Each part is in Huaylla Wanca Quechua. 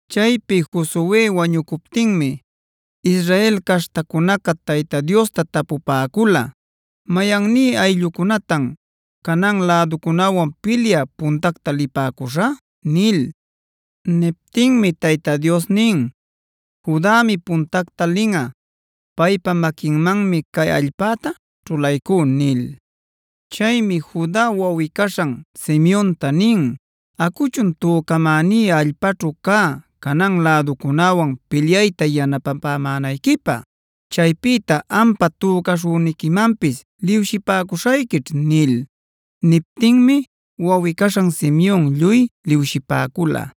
Chaypi Josue wañucuptinmi Israel caśhtacunaca Tayta Diosta tapupäcula: “¿Mayanní ayllucunatan Canaan läducunäwan pilyä puntacta lipäcuśhä?” nil. Niptinmi Tayta Dios nin: “Judami puntacta linꞌa; paypa maquinmanmi cay allpäta ćhulaycú” nil. Chaymi Juda wawꞌi-caśhan Simeonta nin: “Acuchun tücamäní allpaćhu cä Canaan läducunäwan pilyayta yanapapämänayquipä. Chaypïta ampa tücaśhüniquimanpis liwshipäcushayquićh” nil. Niptinmi wawꞌi-caśhan Simeon lluy liwshipäcula.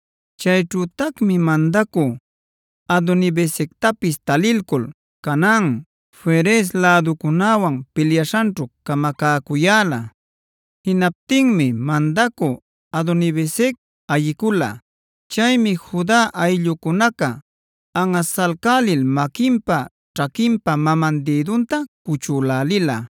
Chayćhütacmi mandacü Adoni-bezectapis talilcul, Canaan, Ferez läducunäwan pilyaśhanćhu camacäcuyäla. Jinaptinmi mandacü Adoni-bezec ayicula. Chaymi Juda ayllucunaca anꞌasalcälil maquinpa, ćhaquinpa maman dïdunta cuchülälila.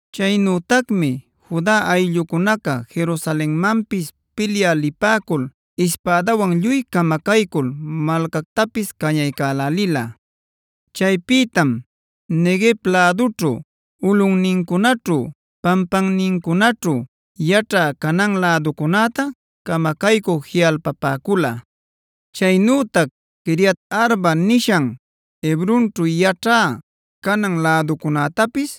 Chaynütacmi Juda ayllucunaca Jerusalenmanpis pilyä lipäcul ispädawan lluy camacaycul malcactapis cañaycälälila. Chaypïtam Neguev lädućhu, ulꞌunnincunaćhu, pampannincunaćhu yaćhä Canaan läducunäta camacaycü jiꞌalpapäcula. Chaynütac “Quiriat-arba” nishan Hebronćhu yaćhä Canaan läducunätapis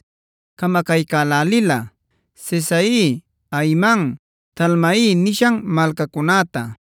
camacaycälälila: Sesai, Ahiman, Talmai nishan malcacunäta.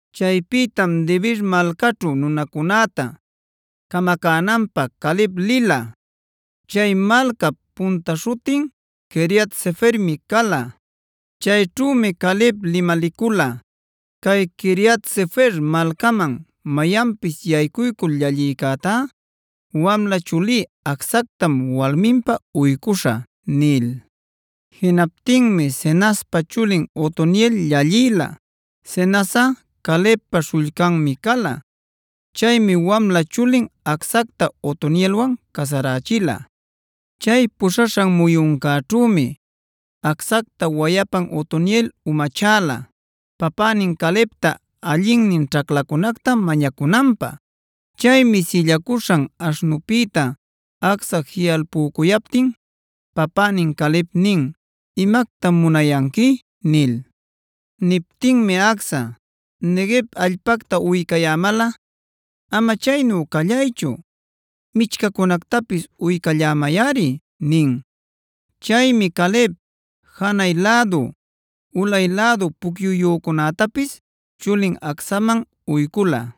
Chaypïtam Debir malcaćhu nunacunäta camacänanpä Caleb lila. Chay malcap punta śhutin Quiriat-sefermi cala. Chayćhümi Caleb limalicula: “Cay Quiriat-sefer malcaman mayanpis yaycuycul llallïcätá wamla chulí Acsactam walminpä uycuśhä” nil. Jinaptinmi Cenazpa chulin Otoniel llallïla; Cenazꞌa Calebpa śhullcanmi cala. Chaymi wamla chulin Acsacta Otonielwan casarächila. Chay puśhaśhan muyuncäćhümi Acsacta wayapan Otoniel umachäla papänin Calebta allinnin ćhaclacunacta mañacunanpä. Chaymi sillacuśhan aśhnunpïta Acsa jiꞌalpucuyaptin papänin Caleb nin: “¿Imactam munayanqui?” nil. Niptinmi Acsa: “Neguev allpacta uycayämalꞌa, ama chaynu callaychu michcacunactapisa uycallämayꞌari” nin. Chaymi Caleb janay lädu, ulay lädu pucyuyücunätapis chulin Acsaman uycula.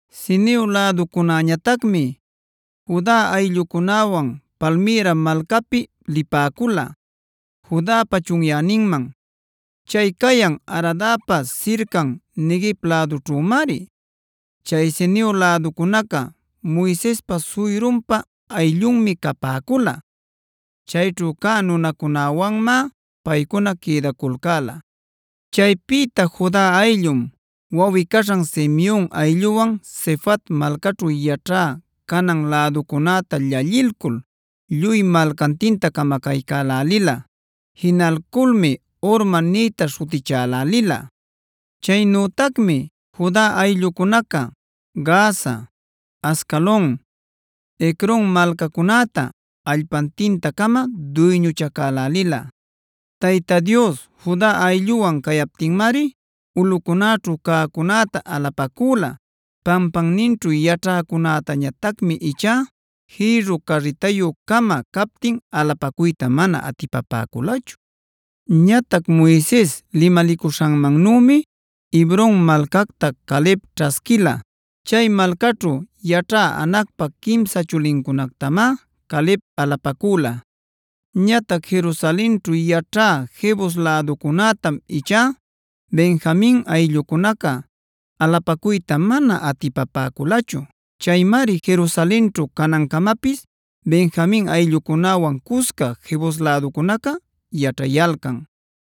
Ceneob läducunäñatacmi Juda ayllucunäwan Palmïra malcapic lipäcula Judapa chunyäninman; chay cayan Aradpa sircan Neguev lädućhümari. Chay Ceneo läducunaca Moisespa suyrunpa ayllunmi capäcula. Chayćhu cä nunacunäwanmá paycuna quïdaculcäla. Chaypïta Juda ayllum wawꞌi-caśhan Simeon aylluwan Sefat malcaćhu yaćhä Canaan läducunäta llallilcul lluy malcantinta camacaycälälila. Jinalculmi Hormad nïta śhutichälälila. Chaynütacmi Juda ayllucunaca Gaza, Ascalon, Ecron malcacunäta allpantinta-cama duyñuchacaycälila. Tayta Dios Juda aylluwan cayaptinmari ulꞌucunäćhu cäcunäta alapacüla. Pampanninćhu yaćhäcunätañatacmi ichá jïrru carritayü-cama captin alapacuyta mana atipapäculachu. Ñatac Moises limalicuśhanmannümi Hebron malcacta Caleb ćhasquila. Chay malcaćhu yaćhä Anacpa quimsa chulincunactamá Caleb alapacüla. Ñatac Jerusalenćhu yaćhä Jebus läducunätam ichá Benjamin ayllucunaca alapacuyta mana atipapäculachu. Chaymari Jerusalenćhu canancamapis Benjamin ayllucunäwan cusca Jebus läducunaca yaćhayalcan.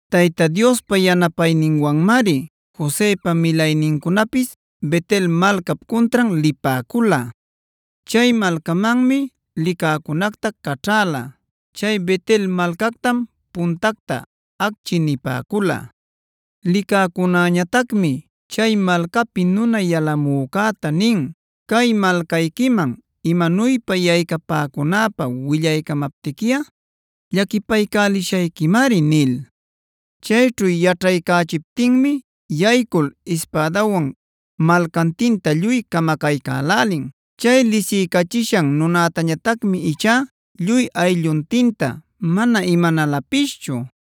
Tayta Diospa yanapayninwanmari Josepa milaynincunapis Bet-el malcap cuntran lipäcula. Chay malcamanmi licäcunacta caćhäla. Chay Bet-el malcactam puntacta “Acchi” nipäcula. Licäcunäñatacmi chay malcapi nuna yalamücäta nin: “Cay malcayquiman imanuypa yaycapäcunäpä willaycamaptiquiꞌa llaquipaycälishayquimari” nil. Chayćhu yaćhaycächiptinmi yaycuycul ispädawan malcantinta lluy camacaycälälin. Chay lisiycachishan nunätañatacmi ichá lluy aylluntinta mana imanälapischu.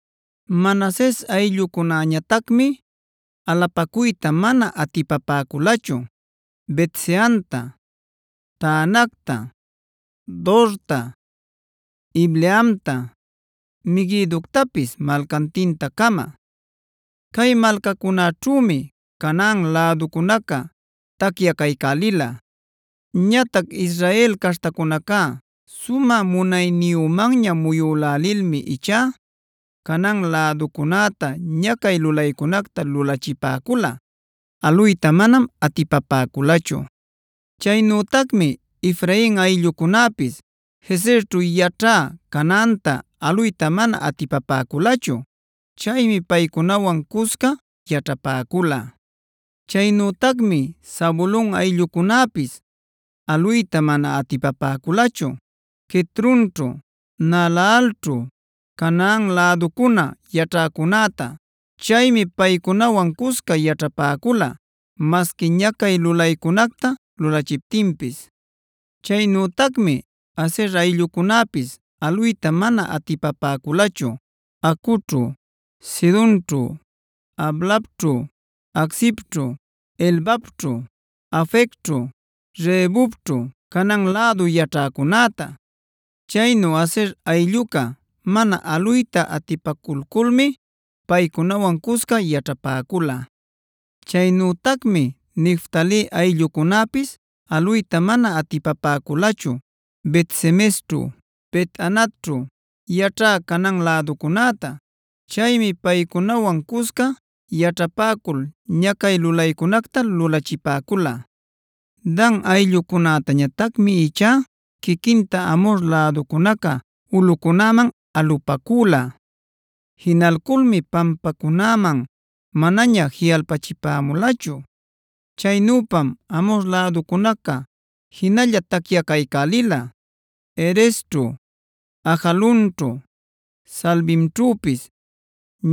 Manases ayllucunäñatacmi alapacuyta mana atipapäculachu: Bet-seanta, Taanacta, Dorta, Ibleamta, Meguidoctapis malcantinta-cama. Cay malcacunäćhümi Canaan läducunaca tacyacaycälila. Ñatac Israel caśhtacunaca sumä munayniyümanña muyülälilmi ichá Canaan läducunäta ñacay lulaycunacta lulachipäcula. Aluytá manam atipapäculachu. Chaynütacmi Efrain ayllucunäpis Gezerćhu yaćhä Canaanta aluyta mana atipapäculachu. Chaymi paycunawan cusca yaćhapäcula. Chaynütacmi Zabulon ayllucunäpis aluyta mana atipapäculachu Quitronćhu, Naalalćhu Canaan läducuna yaćhacunäta. Chaymi paycunawan cusca yaćhapäcula, masqui ñacay lulaycunacta lulachiptinpis. Chaynütacmi Aser ayllucunäpis aluyta mana atipapäculachu Acoćhu, Sidonćhu, Ahlabćhu, Aczibćhu, Helbaćhu, Afecćhu, Rehobćhu Canaan lädu yaćhäcunäta. Chaynu Aser aylluca mana aluyta atipaculculmi paycunawan cusca yaćhapäcula. Chaynütacmi Neftali ayllucunäpis aluyta mana atipapäculachu Bet-semesćhu, Bet-anatćhu yaćhä Canaan läducunäta. Chaymi paycunawan cusca yaćhapäcul ñacay lulaycunacta lulachipäcula. Dan ayllucunätañatacmi ichá quiquinta Amhor läducunaca ulꞌucunäman alupacüla. Jinalculmi pampacunäman manaña jiꞌalpachimulachu. Chaynüpam Amhor läducunaca jinalla tacyacaycälila Heresćhu, Ajalonćhu, Saalbimćhüpis.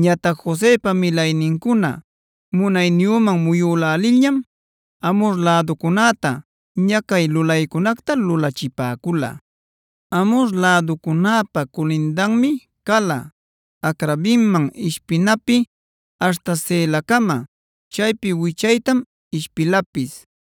Ñatac Josepa milaynincuna munayniyüman muyülälilñam Amhor läducunäta ñacay lulaycunacta lulachipäcula. Amhor läducunäpa culindanmi cala Acrabimman ishpinapi aśhta Selacama, chaypi wichaytam ishpilapis.